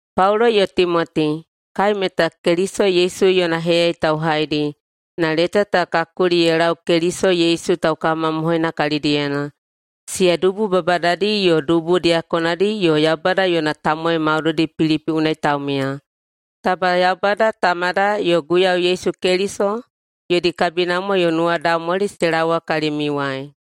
Paulo yo Timoti, kai meta Keliso Yesu yona heyayai tauhaidi na leta ta ka kuli ye lau Keliso Yesu taukawamamohoina kalidiyena, siya dubu babadadi yo dubu diyakonadi yo Yaubada yona tamowai maudoidi Pilipi unai taumiya. Taba Yaubada Tamada yo Guiyau Yesu Keliso yodi kabinamwa yo nuwadaumwali se laowa kalimiuwai.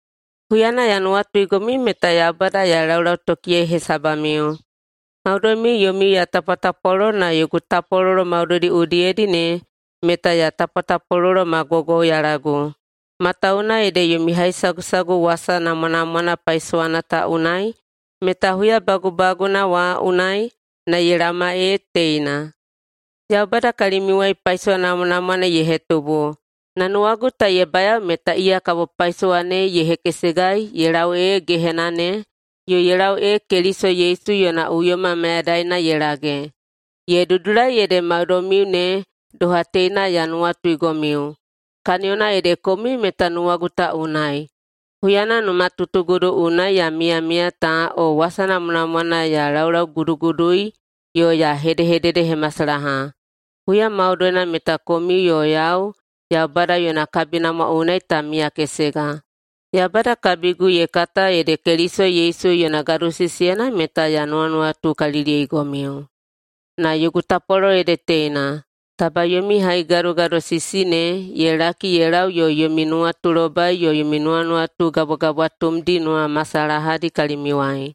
Huyana ya nuwatuigomiu meta Yaubada ya laulautokiyei hesabamiu. Maudoimiu yomiu ya tapwatapwalolo na yogu tapwalolo maudoidi udiyedi ne meta ya tapwatapwalolo ma gwaugwauyalagu, matawuwuna ede yomi haisagusagu wasa namwanamwana paisowana ta unai meta huya bagubaguna wa unai na ye laoma ee teina. Yaubada kalimiuwai paisowa namwanamwana ye hetubu, na nuwagu ta ye bayao meta iya kabo paisowa ne ye hekesegai ye lau ee gehena ne, yo ye lau ee Keliso Yesu yona uyoma mayadaina ye lage. Ye dudulai ede maudoimiu ne doha teina ya nuwatuigomiu, kaniyona ede komiu meta nuwagu ta unai, huyana numatutugudu unai ya miyamiya ta o wasa namwanamwana ya laulaugudugudui yo ya hedehededehemasalaha. Huya maudoina meta komiu yo yau Yaubada yona kabinamwa unai ta miyakesega. Yaubada kabigu ye kata ede Keliso Yesu yona gadosisiyena meta ya nuwanuwatukaliliyeigomiu. Na yogu tapwalolo ede teina, taba yomi haigadogadosisi ne ye laki ye lau yo yomi nuwatulobai yo nuwanuwatu gabwagabwatumdi nuwamasalahadi kalimiuwai.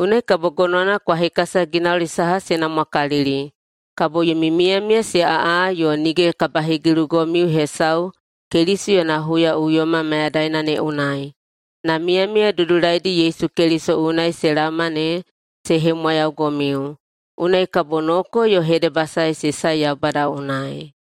Unai kabo gonowana kwa hekasa ginauli saha se namwakalili. Kabo yomi miyamiya se aꞌa yo nige kabahegilugomiu hesau Keliso yona huyaꞌuyoma mayadaina ne unai, na miyamiya dudulaidi Yesu Keliso unai se laoma ne se hemwayaugomiu. Unai kabo noko yo hedebasae se sae Yaubada unai.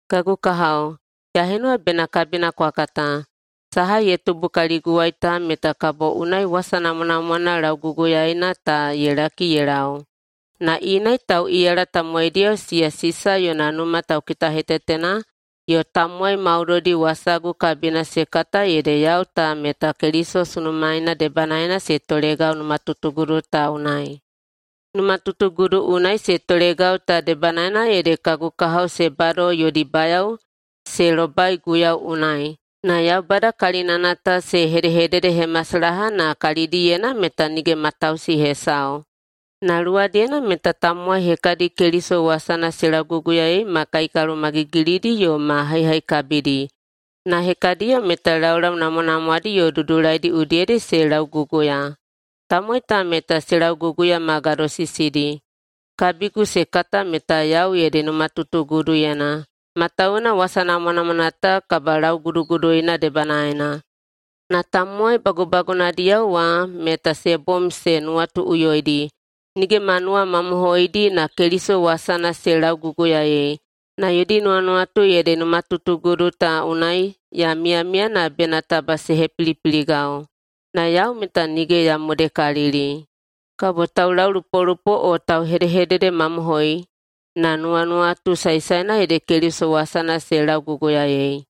Kagu kahao, ya henuwa bena kabina kwa kata, saha ye tubu kaliguwai ta meta kabo unai wasa namwanamwana lauguguyaeina ta ye laki ye lau. Na inai tauꞌiyala tamowaidiyao siya Sisa yona numa taukitahetetena yo tamowai maudoidi wasagu kabina se kata ede yau ta meta Keliso sunumaeina debanaena se tolegau numatutugudu ta unai. Numatutugudu unai se tolegau ta debanaena ede kagu kahao se bado yodi bayao se lobai Guiyau unai na Yaubada kalinana ta se hedehededehemasalaha na kalidiyena meta nige matausi hesau. Na luwadiyena meta tamowai hekadi Keliso wasana se lauguguyaei ma kaikalomagigilidi yo ma haihaikabidi, na hekadiyo meta laulau namwanamwadi yo dudulaidi udiyedi se lauguguya. Tamowai ta meta se lauguguya ma gadosisidi, kabigu se kata meta yau ede numatutuguduyena, matawuwuna wasa namwanamwana ta kabalauguduguduina debanaena. Na tamowai bagubagunadiyao wa meta se bom se nuwatuꞌuyoidi, nige ma nuwamamohoidi na Keliso wasana se lauguguyaei, na yodi nuwanuwatu ede numatutugudu ta unai ya miyamiya na bena taba se hepilipiligau. Na yau meta nige ya modekalili. Kabo taulaulupolupo o tauhedehededemamohoi, na nuwanuwatu saesaena ede Keliso wasana se lauguguyaei.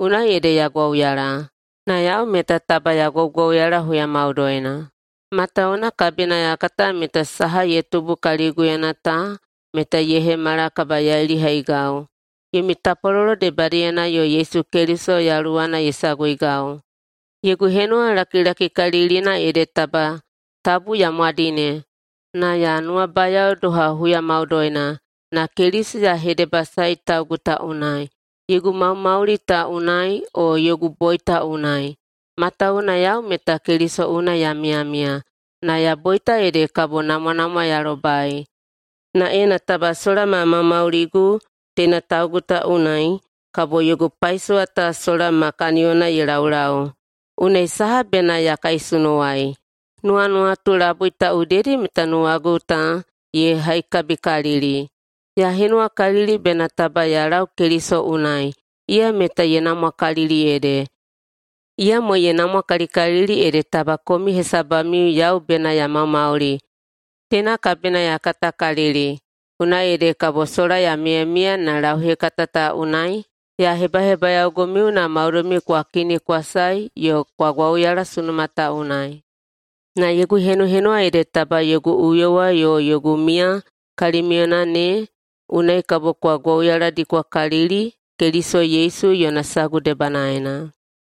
Unai ede ya gwauyala. Na yau meta taba ya gwaugwauyala huya maudoina, matawuwuna kabina ya kata meta saha ye tubu kaliguyena ta meta ye hemala kabayailihaigau, yomi tapwalolo debadiyena yo Yesu Keliso yaluwana ye saguigau. Yogu henuwa lakilakikalilina ede taba tabu ya mwadine, na ya nuwabayao doha huya maudoina, na Keliso ya hedebasaei taugu ta unai, yogu maumauli ta unai o yogu boita unai. Matawuwuna yau meta Keliso unai ya miyamiya, na ya boita ede kabo namwanamwa ya lobai. Na ena taba sola ma maumauligu teina taugu ta unai, kabo yogu paisowa ta sola ma kaniyona ye laulau. Unai saha bena ya kaisunuwai? Nuwanuwatu labui ta udiyedi meta nuwagu ta ye haikabikalili: Ya henuwakalili bena taba ya lau Keliso unai – iya meta ye namwakalili ede. Iyamo ye namwakalikalili ede taba komiu hesabamiu yau bena ya maumauli. Teina kabina ya katakalili, unai ede kabo sola ya miyamiya na lauhekata ta unai ya hebahebayaogomiu na maudoimiu kwa kini kwa sae yo kwa gwauyala sunuma ta unai. Na yogu henuhenuwa ede taba yogu uyowa yo yogu miya kalimiuyena ne unai kabo kwa gwauyaladikwakalili Keliso Yesu yona sagu debanaena.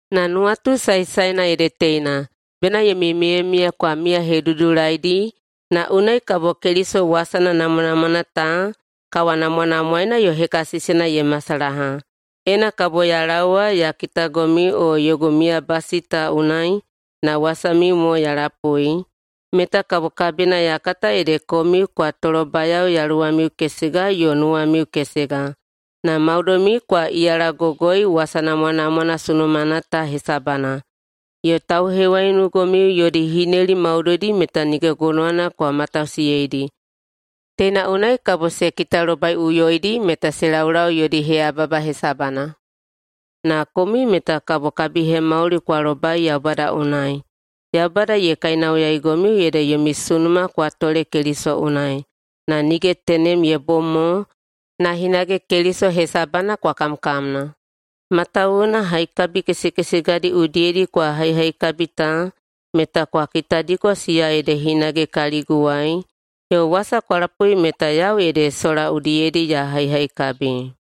Na nuwatu saesaena ede teina: Bena yomi miyamiya kwa miyahedudulaidi na unai kabo Keliso wasana namwanamwana ta kawanamwanamwaeina yo hekasisina ye masalaha. Ena kabo ya laowa ya kitagomiu o yogu miyabasi ta unai na wasamiu mo ya lapui, meta kabo kabina ya kata ede komiu kwa tolobayao yaluwamiu kesega yo nuwamiu kesega, na maudoimiu kwa iyalagogoi wasa namwanamwana sunumana ta hesabana, yo tauhewaiunugomiu yodi hineli maudoidi meta nige gonowana kwa matausiyeidi. Teina unai kabo se kitalobaiꞌuyoidi meta se laulau yodi heyababa hesabana, na komiu meta kabo kabihemauli kwa lobai Yaubada unai. Yaubada ye kainauyaigomiu ede yomi sunuma kwa tole Keliso unai, na nige tenem ye bom mo, na hinage Keliso hesabana kwa kamkamna. Matawuwuna haikabi kesekesegadi udiyedi kwa haihaikabi ta meta kwa kitadiko siya ede hinage kaliguwai yo wasa kwa lapui meta yau ede sola udiyedi ya haihaikabi.